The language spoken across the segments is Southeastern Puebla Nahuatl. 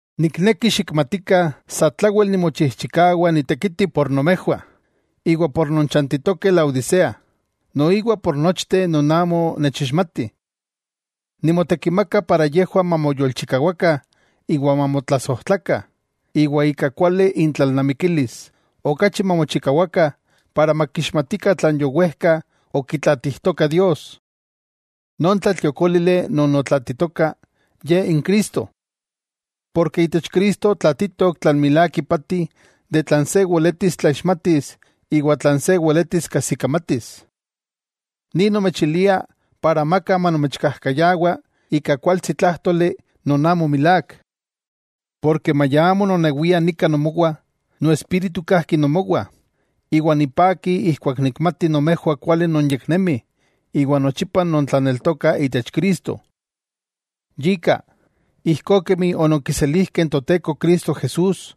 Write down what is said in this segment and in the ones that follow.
Nikneki xikmatikah satlawel nimochijchikawa ni tekiti por nomejwah, iwa por non chantitokeh Laodisea, noiwa por nochteh non amo nechixmatih. Nimotekimaka para yejwah mamoyolchikawakah iwa mamotlasojtlakah, iwa ika kuali intlalnamikilis, okachi mamochikawakah para makixmatikah tlan yowejka okitlaatijtoka Dios. Non tlatliokólili non otlaatitoka, Ye n Cristo. Porke itech Cristo tlaatitok tlan miak ipati de tlan se weletis tlaixmatis iwa tlan se weletis kajsikamatis. Ni nomechilia para amaka manomechkajkayawa ika kualtsi tlájtoli non amo milák. Porke maya amo nonewia nika nomowah, noespíritu kajki nomowah, iwa nipaki ijkuak nikmati nomejwah kuali nonyeknemih iwa nochipa nontlaneltokah itech Cristo. Yika, ijkó kemi ononkiselijkeh n Toteko Cristo Jesús,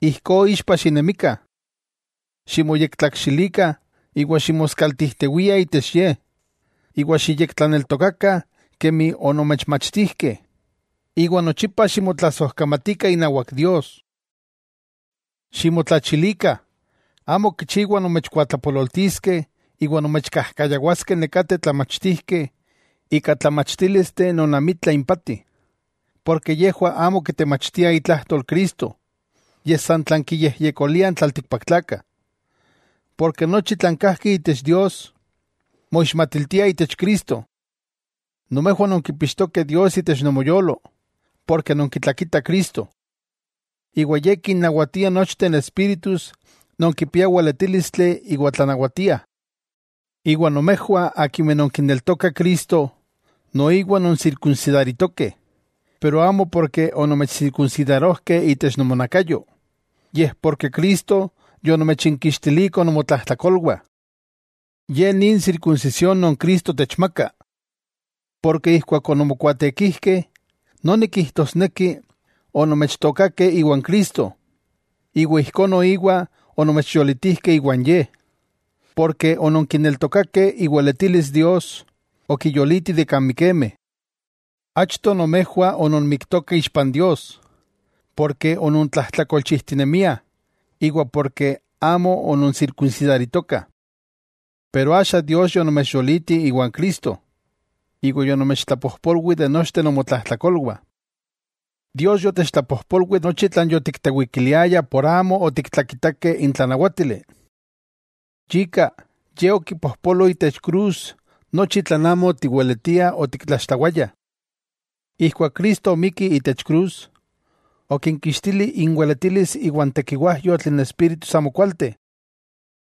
ijkó ixpa xinemikah, ximoyektlakxilikah iwa ximoskaltijtiwiah itech Ye, iwa xiyektlaneltokakah kemi onomechmachtijkeh, iwa nochipa ximotlasojkamatikah inawak Dios. Ximotlachilikah; amo kichiwa nomechkuatlapololtiskeh iwa nomechkajkayawaskeh nekateh tlamachtijkeh ika tlamachtílisteh non amitla impati, porke yejwah amo kitemachtiah itlajtol Cristo, yej san tlan kiyejyekoliah n tlaltikpaktlakah. Porke nochi tlan kajki itech Dios, moixmatiltia itech Cristo. Nomejwah nonkipixtokeh Dios itech nomoyolo, porke nonkitlakitah Cristo. Iwa Ye kinnawatia nochteh espíritus non kipiah weletílistli iwa tlanawatiah. Iwa nomejwah akimeh nonkineltokah Cristo, noiwa nonsirkunsidaritokeh, pero amo porke onomechsirkunsidarojkeh itech nomonakayo, yej porke Cristo yonomechinkixtiliko nomotlajtlakolwah. Ye ni n sirkunsisión non Cristo techmaka. Porke ijkuak ononmokuaatekijkeh, noni kijtosneki onomechtookakeh iwan Cristo, iwa ijkó noiwa onomechyolitijkeh iwan Ye, porke ononkineltokakeh iweletilis Dios okiyoliti de kan mikemeh. Achto nomejwah ononmiktokah ixpa n Dios, porke onontlajtlakolchijtinemiah iwa porke amo ononsirkunsidaritokah. Pero axa Dios yonomechyoliti iwa Cristo, iwa yonomechtlapojpolwi de nochteh nomotlajtlakolwah. Dios yotechtlapojpolwi nochi tlan yotiktewikiliayah por amo otiktlakitakeh n tlanawátili. Yika Ye okipojpolo itech krus nochi tlan amo otiweletiah otiktlaxtlawayah. Ijkuak Cristo omikki itech krus, okinkixtili inweletilis iwa n tekiwajyotl n espíritus amokualteh.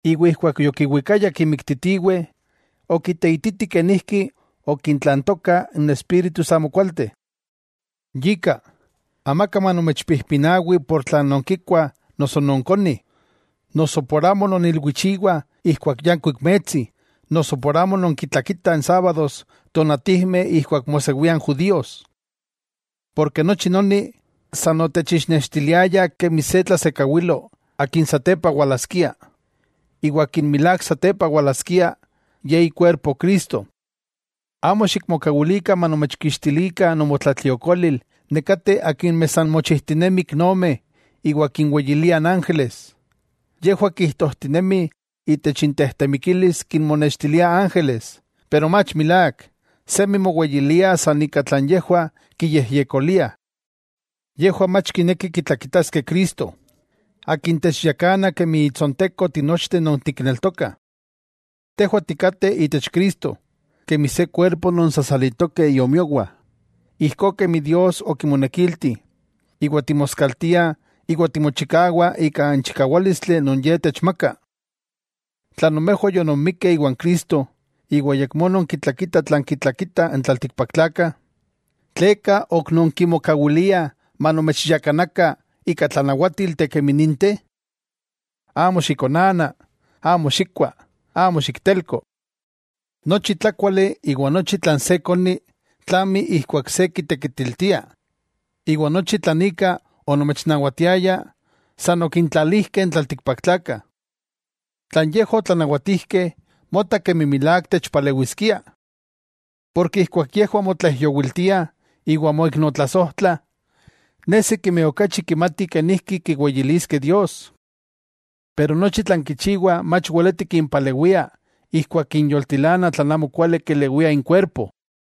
Iwa ijkuak yokiwikayah kimiktitiweh, okiteititi kenijki okintlantokah n espíritus amokualteh. Yika, amaka manomechpijpinawi por tlan nonkikuah noso nonkonih, noso por amo non ilwichiwah ijkuak yankuik metsi, noso por amo nonkintlakitah n sábados tonatijmeh ijkuak mosewia n judíos. Porke nochi noni, san otechixnextiliaya kemi se tlasekawilo Akin satepa walaskia, iwa Akin milák satepa walaskia, Ye ikuerpo Cristo. Amo xikmokawilikah manomechkixtilikah nomotlatliokolil nekateh akimeh san mochijtinemih iknomeh iwa kinweyiliah n ángeles. Yejwah kijtojtinemih itech intejtemikilis kinmonextiliah ángeles. Pero mach milák. Semi moweyiliah san ika tlan yejwah kiyejyekoliah. Yejwah mach kinekih kitlakitaskeh Cristo, Akin techyakana kemi itsonteko tinochteh non tikneltokah. Tejwah tikateh itech Cristo, kemi se kuerpo non sasalitokeh iomiowah, ijkó kemi Dios okimonekilti; iwa timoskaltiah iwa timochikawah ika n chikawálistli non Ye techmaka. Tla nomejwah yononmikkeh iwan Cristo, iwa ayakmó nonkitlakitah tlan kitlakitah n tlaltikpaktlakah, ¿tleka ok nonkimokawiliah manomechyakanakah ika tlanawátilteh kemi ninteh? “Amo xikonana, amo xikkua, amo xiktelko.” Nochi tlákuali iwa nochi tlan se koni tlami ijkuak se kitekitiltia, iwa nochi tlan ika onomechnawatiayah san okintlalijkeh n tlaltikpaktlakah. Tlan yejwah otlanawatijkeh, mota kemi milák techpalewiskia. Porke ijkuak yejwah motlaijyowiltiah iwa moiknotlasojtlah, nesi kemi okachi kimatih kenijki kiweyiliskeh Dios. Pero nochi tlan kichiwah mach weleti kimpalewia ijkuak kinyoltilana tlan amokuali kelewiah inkuerpo.